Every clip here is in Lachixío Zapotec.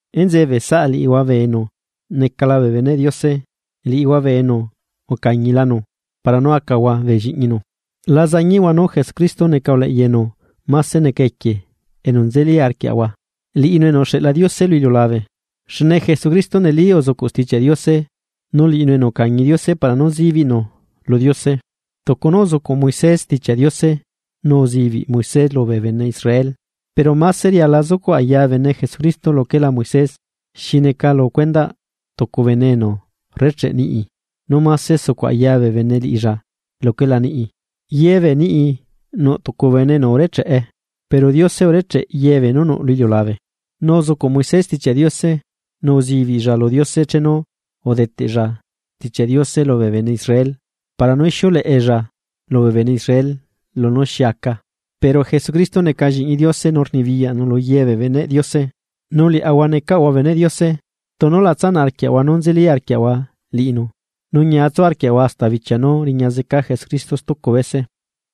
Enzeꞌe bee saꞌa liꞌihua bee enu necala bee beneꞌ Diose liꞌihua bee enu ucañilanu, para nú acahua bee lliꞌñinu, la zañiꞌhua nú Jesucristo neca uleꞌya enu máse neca equie enu nzeli arquiaꞌahua, liꞌinu enu uxeꞌla Diose lu iliulabe. Xne Jesucristo neli uzucuꞌ Stichiaꞌ Diose nu liꞌinu enu ucañi Diose para nú zibiꞌnu lu Diose, tucu nú uzucuꞌ Moisés Stichiaꞌ Diose nu uzibiꞌ Moisés lubee bene Israel. Pero máse riala zucuꞌ aya bene Jesucristo luquela Moisés, xi neca lu cuendaꞌ tucu bene enu rrecheꞌ niꞌi nú máse sucuꞌ aya bee bene liꞌilla luquela niꞌi. Ye bee niꞌi nuꞌ tucu bene enu urecheꞌe, pero Diose urecheꞌ yebee nú nuꞌ lu iliulabe. Nu uzucuꞌ Moisés Stichiaꞌ Diose, nu uzibiꞌlla lu Diose chenu udeteꞌlla stichia Diose lubee bene Israel para nú ixiuleꞌella lubee bene Israel lunú xi aca. Pero Jesucristo neca lliꞌñi Diose nu rnibiyaꞌnu lu yebee beneꞌ Diose. Nu liaꞌahua necaꞌahua beneꞌ Diose, tunu la tsanaꞌ arquiaꞌahua nú nzeli arquiaꞌahua liꞌinu, nu ñia tsu arquiaꞌahua hasta bichia nú riña zeca Jesucristo stucu bese.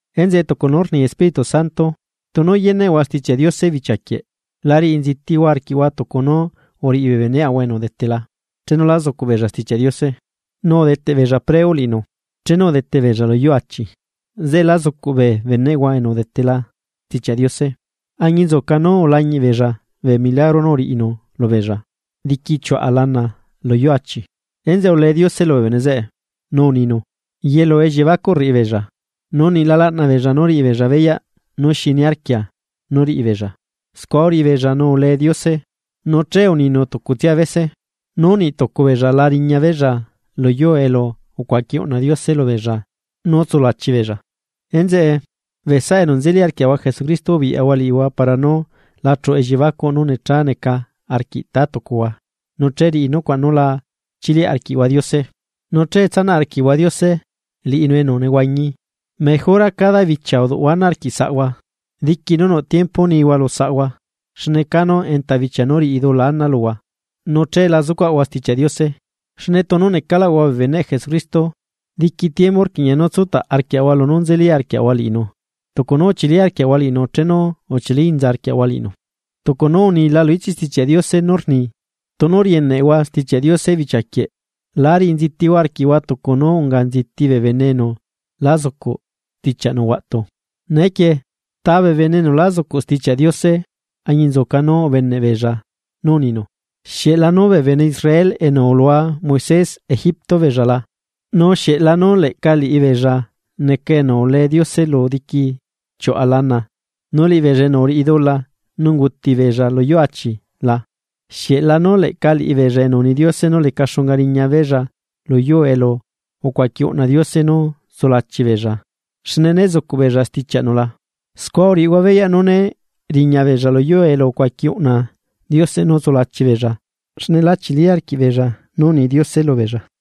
Enzeꞌe tucu nú rni Espíritu Santo: Tunu yeneꞌhua Stichiaꞌ Diose bichia quieꞌ. La riꞌi nzitihua arquiꞌhua tucu nú uriꞌi bee beneꞌahua enu udetela chenu lá zucuꞌ beella Stichiaꞌ Diose, nu udeteꞌ beella preu liꞌinu, chenu udete beella lu yuu achi. Zeꞌe lá zucuꞌ bee beneꞌhua enu udetela Stichiaꞌ Diose, añinzuca nú ulañiꞌ beella bee milagro nú uriꞌinu lubeella, diqui chiuꞌa lana lu yuu achi. Enzeꞌe ulee Diose lubee bene zeꞌe, nu uninu: “Yelu elliebacuꞌ rriꞌi beella, nu niꞌ la laꞌna beella nú riꞌi beella beyaꞌ nú xi niarquia nú riꞌi beella.” Scua uriꞌi beella nú ule Diose nu che uninu tucutsia bese, nú niꞌ tucu beella la riña beella lu yuu elu ucuaqui uꞌna Diose lubeella nú tsulachi beella. Enzeꞌe, bee saꞌa enu nzeli arquiaꞌahua Jesucristo ubiꞌyahua liꞌihua para nú la chuꞌu elliebacuꞌ nú necha neca arquiꞌ tá tucuhua nu che riꞌi nucuaꞌ nú la chiliaꞌ arquiꞌhua Diose. Nu che tsanaꞌ arquiꞌhua Diose liꞌinu enu nehuañi. Mejora cada bichia uduꞌhua ana arquiꞌ saꞌhua, diqui nú nuꞌ tiempo nihua lu saꞌhua xne canu enta bichia nú riꞌi dula ana luhua, nu che la zucuaꞌhua Stichiaꞌ Diose. Xne tunu necaꞌlaꞌahua bee beneꞌ Jesucristo, diqui tiempu rquiꞌña nú tsutaꞌ arquiaꞌahua lunú nzeli arquiaꞌahua liꞌinu tucu nú uchili arquiaꞌahua liꞌinu chenu uchili inza arquiaꞌahua liꞌinu. Tucu nú unila lu ichiꞌ Stichiaꞌ Diose nú rni: Tunu rieneꞌhua Stichiaꞌ Diose bichia quieꞌ, la riꞌi nzitihua arquiꞌhua tucu nú unga nziti bee bene enu lá zucuꞌ stichiaꞌnu huaꞌtu. Neequie, ¿ta bee bene enu lá zucuꞌ Stichiaꞌ Diose añinzuca nú ubeneꞌ beella nú uninu? ¿Xieꞌ lanú bee bene Israel enu ulua Moisés Egipto beella la? ¿Nu xieꞌ lanu leꞌca liꞌibeella neca enu ule Diose lu diquiꞌ chiuꞌa lana, nu liꞌibeella enu uriꞌi dula nu unguti beella lu yuu achi la? ¿Xieꞌ lanú leꞌca liꞌibeella enu uni Diose nú leca xunga riñabeella lu yuu elu ucuaqui unꞌna Diose nú tsulachi beella xne né zucuꞌ beella stichiaꞌnu la? Scua rriaꞌahua beyaꞌ nú né riñabeella lu yuu elu ucuaqui uꞌna Diose nú tsulachi beella xne lá chili arquiꞌbeella nú uni Diose lubeella.